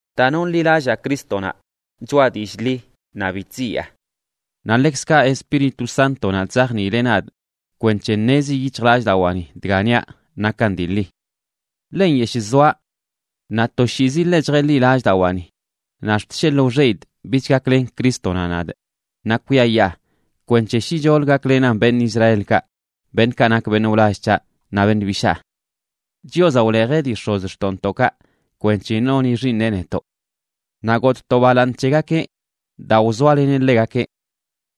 Daa nonḻilallaa Crístonaꞌ choꞌa dillꞌ ḻi, naꞌ bi chziyaa. Naꞌ ḻekzkaꞌ Espíritu Sántonaꞌ chzajniileꞌ nadꞌ kwenc̱he ṉezi yic̱hjlallꞌdawaani dga niaꞌ nakan dii ḻi. Ḻe nyeshꞌ zoaꞌ naꞌ toshiizi ḻe chjeḻi lallꞌdawaani, naꞌ ax̱t sheḻꞌ wxeꞌidꞌ bich gaklen Crístonaꞌ nadꞌ naꞌ kwiayaa kwenc̱he shicholə gaklenan beṉꞌ Israelkaꞌ beṉꞌkaꞌ nak beṉꞌ wlall c̱haꞌ naꞌ beṉꞌ bishaa. Chiozaꞌ wlejeꞌ dii x̱ozxtoꞌntoꞌkaꞌ kwenc̱he noni xiiṉeꞌ netoꞌ. Naꞌ gotꞌ to balaaṉ c̱hegakeꞌ daa wzoaleneꞌ ḻegakeꞌ.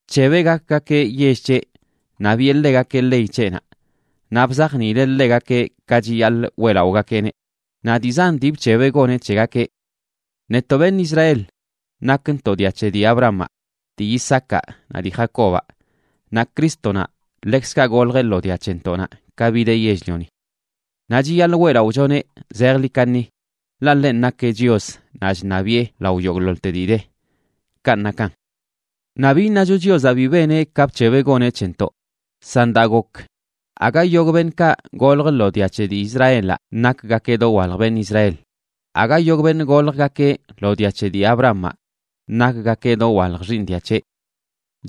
Bc̱hebeꞌ gakgakeꞌ yell c̱heꞌ, naꞌ biꞌe ḻegakeꞌ ley c̱heꞌnaꞌ. Naꞌ bzajniileꞌ ḻegakeꞌ ka chiyaḻꞌ weꞌlaꞌogakeꞌneꞌ, naꞌ dii zan dii bc̱hebeꞌ goneꞌ c̱hegakeꞌ. Netoꞌ beṉꞌ Israel nakntoꞌ dia c̱he dii Abrahamaꞌ, dii Isaacaꞌ naꞌ dii Jacobaꞌ, naꞌ Crístonaꞌ ḻekzkaꞌ goljeꞌ lo dia c̱hentoꞌnaꞌ ka bideꞌ yell-lioni. Naꞌ chiyaḻꞌ weꞌlaꞌochoneꞌ zejḻi kaṉi, ḻaꞌ ḻenꞌ nakeꞌ Chios naꞌ chṉabiꞌe lao yogꞌḻoḻte dii de. Kanꞌ nakan. Naꞌ bi iṉacho Chiozaꞌ bi beneꞌ ka bc̱hebeꞌ goneꞌ c̱hentoꞌ, san daa gok, aga yogꞌ beṉꞌkaꞌ golj lo dia c̱he dii Israelaꞌ nakgakeꞌ dowalj beṉꞌ Israel. Aga yogꞌ beṉꞌ goljgakeꞌ lo dia c̱he dii Abrahamaꞌ nakgakeꞌ dowalj xiiṉ dia c̱heꞌ.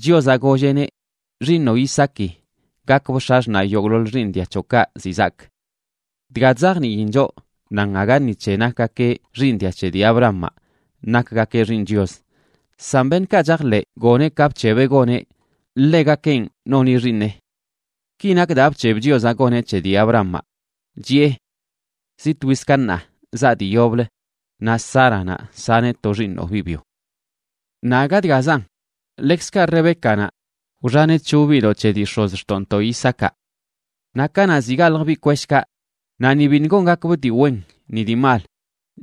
Chiozaꞌ golleꞌneꞌ: “Xiiṉoꞌ Isaaki gakbꞌ x̱axṉaꞌ yogꞌḻoḻ xiiṉ dia c̱hoꞌkaꞌ ziꞌ zaak.” Dga chzajniin choꞌ nan aga ni c̱he nakgakeꞌ xiiṉ dia c̱he dii Abrahamaꞌ nakgakeꞌ xiiṉ Chios, san beṉꞌkaꞌ chajḻeꞌ goneꞌ ka bc̱hebeꞌ goneꞌ, ḻegakenꞌ noni xiiṉeꞌ. Ki nak daa bc̱heb Chiozaꞌ goneꞌ c̱he dii Abrahamaꞌ, chiꞌe: “Zi twiz ka ṉaa zaa dii yoblə, naꞌ Sáranaꞌ saneꞌ to xiiṉoꞌ biꞌ byo.” Naꞌ aga dgazan. Ḻekzkaꞌ Rebécanaꞌ wxaneꞌ c̱hop biꞌdoꞌ c̱he dii x̱ozxtoꞌntoꞌ Isaacaꞌ. Naꞌ kanaꞌ ziꞌ galj biꞌ kweshkaꞌ, naꞌ ni biṉꞌ gongakbꞌ dii wen ni dii mal,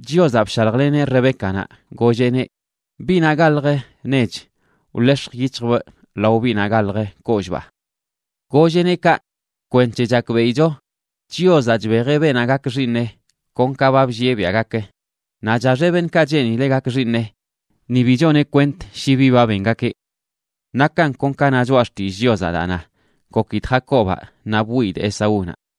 Chiozaꞌ bshaljleneꞌ Rebécanaꞌ, golleꞌneꞌ: “Biꞌnaꞌ galjə nech wḻex̱j yic̱hjbꞌ lao biꞌnaꞌ galjə kollꞌbaa.” Golleꞌneꞌ kaꞌ kwenc̱he chakbeꞌicho Chiozaꞌ chbejeꞌ beenaꞌ gak xiiṉeꞌ kon ka ba bllieꞌ biaꞌ gak, naꞌ chaxeꞌ beṉꞌkaꞌ cheenileꞌ gak xiiṉeꞌ, ni bi choneꞌ kwent shi bi ba bengakeꞌ. Nakan kon ka na Choꞌa Xtillꞌ Chiozaꞌ daa na: “Gokidꞌ Jacobaꞌ, naꞌ bwiyidꞌ Esaúnaꞌ.”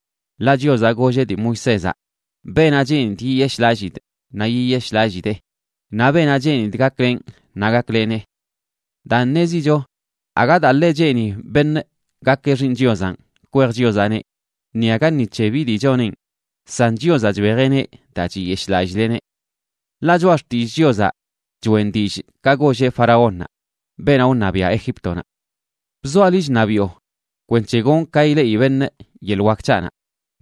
Ḻaꞌ Chiozaꞌ golleꞌ dii Moisézaꞌ: “Beenaꞌ cheenidꞌ yiyeshꞌlallidꞌ naꞌ yiyeshꞌlallidee, naꞌ beenaꞌ cheenidꞌ gaklenꞌ naꞌ gaklenee.” Daan, ṉezicho aga daa ḻe cheeni beṉꞌ gakeꞌ xiiṉ Chiozanꞌ kwej Chiozaꞌneꞌ, ni aga ni c̱he bi dii choneꞌn, san Chiozaꞌ chbejeꞌneꞌ daa chiyeshꞌlallileꞌneꞌ. Ḻaꞌ Choꞌa Xtillꞌ Chiozaꞌ choꞌen dillꞌ ka golleꞌ faraónnaꞌ, beenaꞌ wṉabiaꞌ Egíptonaꞌ: “Bzoaꞌ liꞌ chṉabiꞌo kwenc̱he gonꞌ ka ileꞌi beṉꞌ yeḻꞌ wak c̱haꞌnaꞌ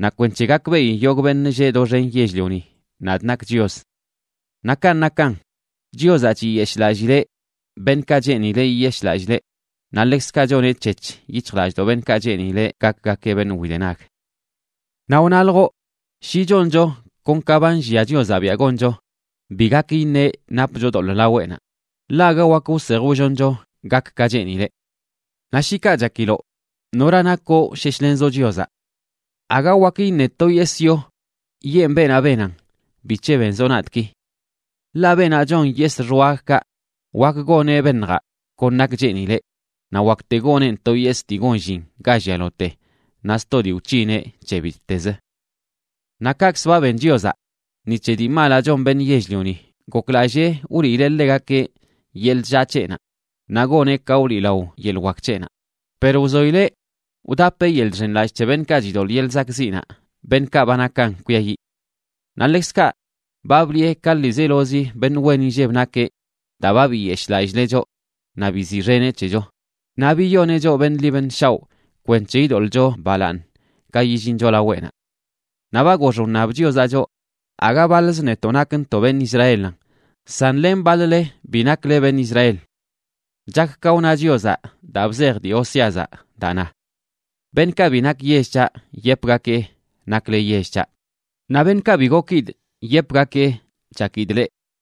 naꞌ kwenc̱he gakbeꞌi yogꞌ beṉꞌ lleꞌ doxen yell-lioni nadꞌ nakꞌ Chios.” Naꞌ kanꞌ nakan, Chiozaꞌ chiyeshꞌlallileꞌ beṉꞌkaꞌ cheenileꞌ yiyeshꞌlallileꞌ, naꞌ ḻekzkaꞌ choneꞌ c̱hec̱h yic̱hjlallꞌdoꞌ beṉꞌkaꞌ cheenileꞌ gakgakeꞌ beṉꞌ widenag. Naꞌ wnaljoꞌ: “Shi choncho kon ka ba nllia Chiozaꞌ biaꞌ goncho, bi gak iṉeꞌ napcho doḻꞌ laweꞌnaꞌ, ḻaꞌ aga wakə wsej wlloncho gak ka cheenileꞌ.” Naꞌ shi kaꞌ chakiloꞌ, ¿nora nakoꞌ wsheshlenzoꞌ Chiozaꞌ? Aga wak iṉe to yesꞌ yo yeen beenaꞌ benan: “¿Bic̱he benzoꞌ nadꞌ ki?” Ḻaꞌ beenaꞌ chon yesꞌ xwagkaꞌ wakə goneꞌ beṉjaꞌ kon nak cheenileꞌ, naꞌ wakte goneꞌn to yesꞌ dii gon llin ga llialote, naꞌ sto dii wc̱hineꞌ c̱he bittez. Naꞌ kaꞌkzə ba ben Chiozaꞌ. Ni c̱he dii malaꞌ chon beṉꞌ yell-lioni goklallee wliileꞌ ḻegakeꞌ yeḻꞌ chllaa c̱heꞌnaꞌ naꞌ goneꞌ ka wliꞌlao yeḻꞌ wak c̱heꞌnaꞌ, per wzoileꞌ wdapeꞌ yeḻꞌ chxenlallꞌ c̱he beṉꞌkaꞌ chidoḻꞌ yeḻꞌ zakꞌziꞌnaꞌ, beṉꞌkaꞌ ba nakan kwiayiꞌ. Naꞌ ḻekzkaꞌ, ba bliꞌe ka ḻiizelozi beṉꞌ wen inlleb nakeꞌ daa ba biyeshꞌlallileꞌ choꞌ naꞌ biziꞌxeneꞌ c̱hecho, naꞌ biyoneꞌ choꞌ beṉꞌ ḻi beṉꞌ shaoꞌ kwenc̱he idoḻꞌcho balaaṉ ka yillincho laweꞌnaꞌ. Naꞌ ba gox wṉab Chiozaꞌ choꞌ, aga baḻz netoꞌ nakntoꞌ beṉꞌ Israelanꞌ, san len baḻ-le bi nakle beṉꞌ Israel. Chak ka wna Chiozaꞌ daa bzej dii Oseazaꞌ, daa na: Beṉꞌkaꞌ bi nak yell c̱haꞌ, yepgakee: “Nakle yell c̱haꞌ.” Naꞌ beṉꞌkaꞌ bi gokidꞌ, yepgakee: “Chakidꞌ leꞌ.”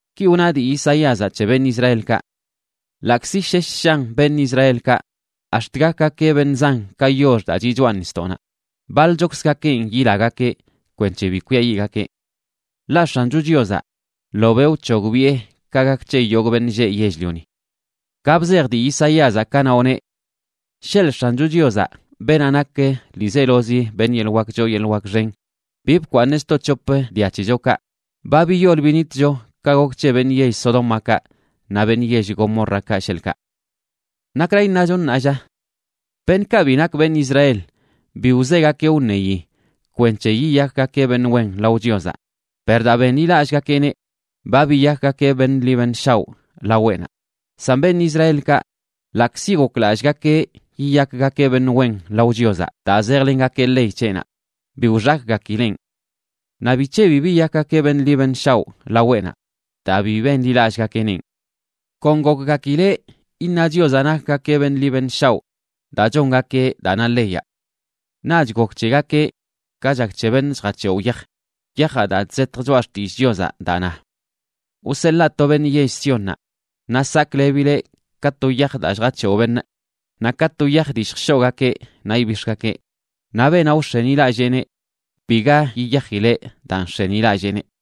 Ki wna dii Isaíazaꞌ c̱he beṉꞌ Israelkaꞌ: “Ḻaꞌkzi shesh shan beṉꞌ Israelkaꞌ ax̱t gakgakeꞌ beṉꞌ zan ka yox daa chiꞌ choꞌa nisdoꞌnaꞌ, baḻchokzgakenꞌ yilagakeꞌ kwenc̱he bi kwiayiꞌgakeꞌ. Ḻaꞌ X̱ancho Chiozaꞌ ḻobeꞌ wc̱hogbiꞌe ka gak c̱he yogꞌ beṉꞌ lleꞌ yell-lioni.” Ka bzej dii Isaíazaꞌ, kanaꞌ wneꞌ: Sheḻꞌ X̱ancho Chiozaꞌ, beenaꞌ nak ḻiizelozi beṉꞌ yeḻꞌ wak choo yeḻꞌ wak xen, bi bkwaaṉeꞌ sto c̱hop dia c̱hechokaꞌ, ba biyol binitcho ka gok c̱he beṉꞌ yell Sodómakaꞌ naꞌ beṉꞌ yell Gomórrakaꞌ, sheḻꞌkaꞌ. ¿Nakra iṉacho, ṉaa lla? Beṉꞌkaꞌ bi nak beṉꞌ Israel bi wzegakeꞌ wṉeyi kwenc̱he yiyakgakeꞌ beṉꞌ wen lao Chiozaꞌ, per daa benḻilallꞌgakeꞌneꞌ, ba biyakgakeꞌ beṉꞌ ḻi beṉꞌ shaoꞌ laweꞌnaꞌ. San beṉꞌ Israelkaꞌ, ḻaꞌkzi goklallꞌgakeꞌ yiyakgakeꞌ beṉꞌ wen lao Chiozaꞌ daa zejlengakeꞌ ley c̱heꞌnaꞌ, bi wxakgakileꞌn. Naꞌ ¿bic̱he bi biyakgakeꞌ beṉꞌ ḻi beṉꞌ shaoꞌ laweꞌnaꞌ? Daa bi benḻilallꞌgakeꞌnenꞌ. Kon gokgakileꞌ iṉa Chiozaꞌ nakgakeꞌ beṉꞌ ḻi beṉꞌ shaoꞌ daa chongakeꞌ daa na leyaꞌ. Naꞌch gok c̱hegakeꞌ ka chak c̱he beṉꞌ chjac̱hewꞌ yaj, yajaꞌ daa chzetj Choꞌa Xtillꞌ Chiozaꞌ, daa na: Wseḻaa to beṉꞌ yell Siónnaꞌ, naꞌ saklebileꞌ ka to yaj daa chjac̱hewꞌ beṉꞌ, naꞌ ka to yaj dii lljshoꞌgakeꞌ naꞌ ibix̱gakeꞌ. Naꞌ beenaꞌ wx̱enilalleeneꞌ, biga yiyajileꞌ daa nx̱enilalleeneꞌ.